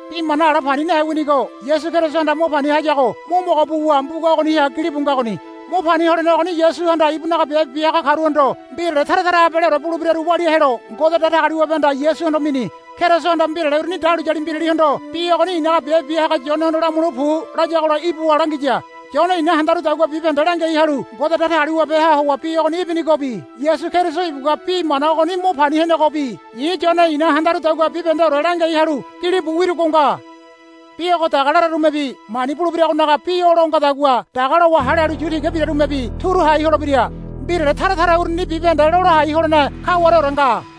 Bi moana ala pani nahe winigo Yasu Kerisohanda mo pani hayago mo mogo buwa mbuga ogoniha gilibu ngagoni. Mo pani holene ogoni Yasuhanda ibunaga biabe bia haga karuhondo mbirale tara tara abaleore bulebiraru walia helo Ngode Datagaliwabehanda Yasuhondo mini. Kerisohanda mbirale uruni dahuliyali mbiralihondo, Bi ogoni i̱naga biabe bia haga Yonehondo lamule pu, layagola ibuwa langiya. Yone i̱na handarudagua bibahende langiai halu Ngode Datagaliwabeha howa bi ogoni ibinigobi Yasu Keriso ibugua bi mana ogoni mo pani henegobi i̱ Yone i̱na handarudagua bibahendeore langiai halu gilibu wirugo nga. Bi ogo daga lararumebi mani bulebiragonaga bi o lo ngadagua daga lowa hale halu yu tiga birarumebi turu hai holebira. Mbirale tara tara uruni bibahende lola hai holene kawareore nga.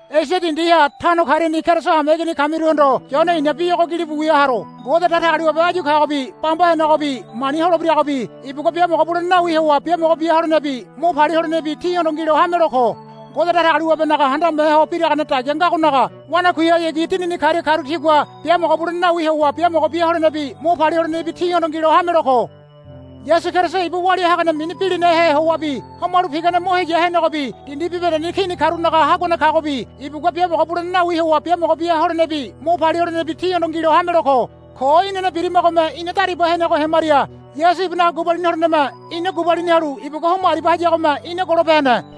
Esia dindiha tano kariani Keriso hameigini kamiruhondo Yone i̱na bi ogo gilibu wia haro. Ngode Datagaliwabe áyu kagobi bamba henegobi mani holebiragobi ibugua biamogo bulene nawi howa biamogo bia holenebi mo palia holenebi tíhondo ngilo hamelo ko. Ngode Datagaliwabenaga handame ho biragane dagia ngagonaga wanakuihayagi dinini karia karu tigua biamogo bulene nawi howa biamogo bia holenebi mo palia holenebi tíhondo ngilo hamelo ko. Yasu Keriso ibu walia hagane mini bilinahe howabi homalu pigane mo heya henegobi dindi bibahendeni kini karunaga haguane kagobi ibugua biamogo bulene nawi howa biamogo bia holenebi mo palia holenebi tíhondo ngilo hamelo ko. Ko inane birimagome ina dariba henego hemaria Yasu ibunaga gubalini holeneme ina gubalini halu ibugua homo aribia hayagome ina golope hene.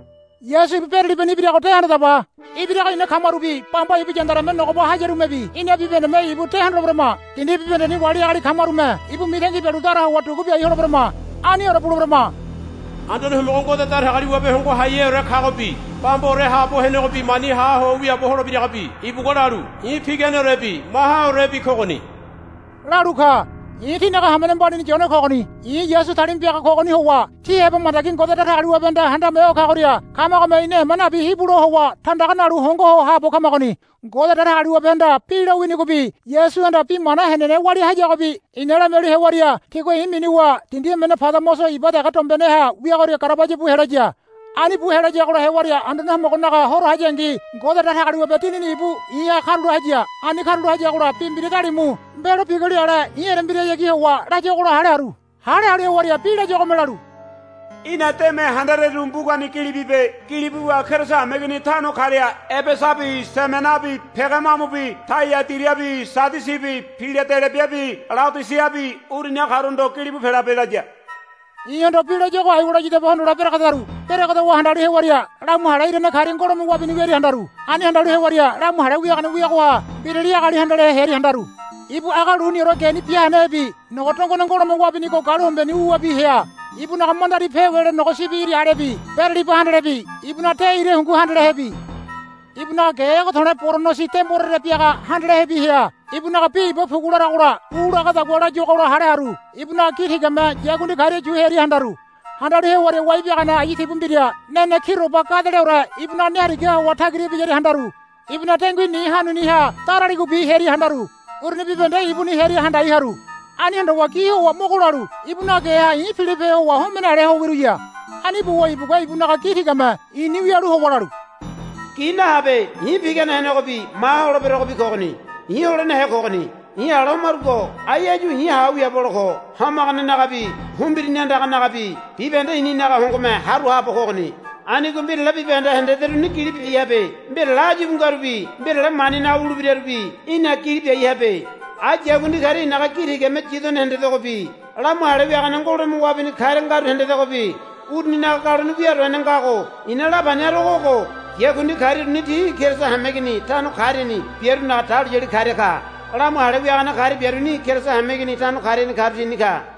Yasu ibu beralibani ibirago de handadaba. Ibirago ina kamarubi bamba ibu yandareme nogoba hayarumebi ina bibahendeme ibu de hondoleberama. Dindi bibahendeni wali agali kamarume ibu mitangi bialu dara howa dugu biai holeberama. Aniore buleberama. Anduane Homogo Ngode Datagaliwabe Hongo Haiheore kagobi bambaore haabo henegobi mani ha ho wiaabo holebiragobi ibugua lalu, I̱ piganeorebi mahaorebi kogoni, lalu ka. I̱ tínaga hamene mbalini Yone kogoni. I̱ Yasu talima piaga kogoni howa tí heba mandagi Ngode Datagaliwabehanda Handame Ho Kagoria kamagome ina ema nabi hibulo howa tandaga nalu hongo ho haabo kamagoni. Ngode Datagaliwabehanda bi lo winigobi Yasuhanda bi mana henene walia hayagobi i̱na lamialu hewaria tigua i̱ minuwa dindi emene Padamoso iba dege dombeneha wiagoria garabaya bu helaya. Ani bu helayagola hewaria Anduane Homogonaga horo hayangi Ngode Datagaliwabe Dinini ibu i̱ha karula haya. Ani karula hayagola bi mbira dalimu mbelo biguli ale i̱ erembirahayagi howa layuagola hale haru. Hale halu hewaria bi layuagome lalu, Í̠na deme handareru mbugani gili bibe. Gili buwa Keriso hameigini tano karia Ebesabi Simenabi Pegamamubi Taiadirabi Sadisibi Piladelebiabi Leodisiabi uruniha karuhondo gilibu pelabe, laya. I̱hondo bi layuago aiwa layadabe hondole beregedaru. Beregedowa handalu hewaria lamu hale irane karia ngolome wabini wiaria handaru. Ani handalu hewaria lamu hale wiagane wiagoha mbirali agali handalehe hearia handaru. Ibu aga luniore geni bia hanahebi nogo dongone ngolome wabinigo galuhombeneni wuwabi hea. Ibunaga mandari pewele nogo sibi iri alebi beraliba handalehebi ibunaga de ira hungu handalehebi ibunaga ge ege to̱le̱ boronosi demborere biaga handalehebi hea. Ibunaga bi iba pugu laragola u lagadagua layuagola hale haru. Ibunaga gi tigame yakundi karia yu hearia handaru. Handalu hewaria wai biagane ayu tibu mbira nene kiroba gadeleore ibunaga ne harigaha howa tagira ibiyaria handaru. Ibunaga dengui ni hanuni ha daraligobi hearia handaru. Uruni bibahende ibuni hearia handai haru. Ani hondowa gi howa mogo lalu ibunaga geha i̱ pilope howa homene ale ho wiruya. Ani buwa ibugua ibunaga gi tigame i̱ni wialu howa lalu, Gi nahabe. I̱ pigane henegobi maha holeberogobi kogoni. I̱ holenehe kogoni. I̱ ala homarugo ai áyu i̱ ha ho wiaabo hole ko. Homaganenagabi humbirini andanagabi bibahende i̱ninaga hongome haru haabo kogoni. Anigo mbirale bibahende hendederuni gili biai habe. Mbirale áyu íbu ngarubi mbirale maninaga wulebirarubi í̠na gili biai habe. Ai yakundi karia i̱naga gi tigame yidone hendedegobi lamu hale wiagane ngolome wabinigo karia ngaru hendedegobi uruninaga galone wia do hene ngago i̱na lapani harogo ogo. Yakundi karia uruni ti Keriso hameigini tano kariani biarunaga dahuliyali karia ka. Lamu hale wiagane karia biaruni Keriso hameigini tano kariani karu tini ka.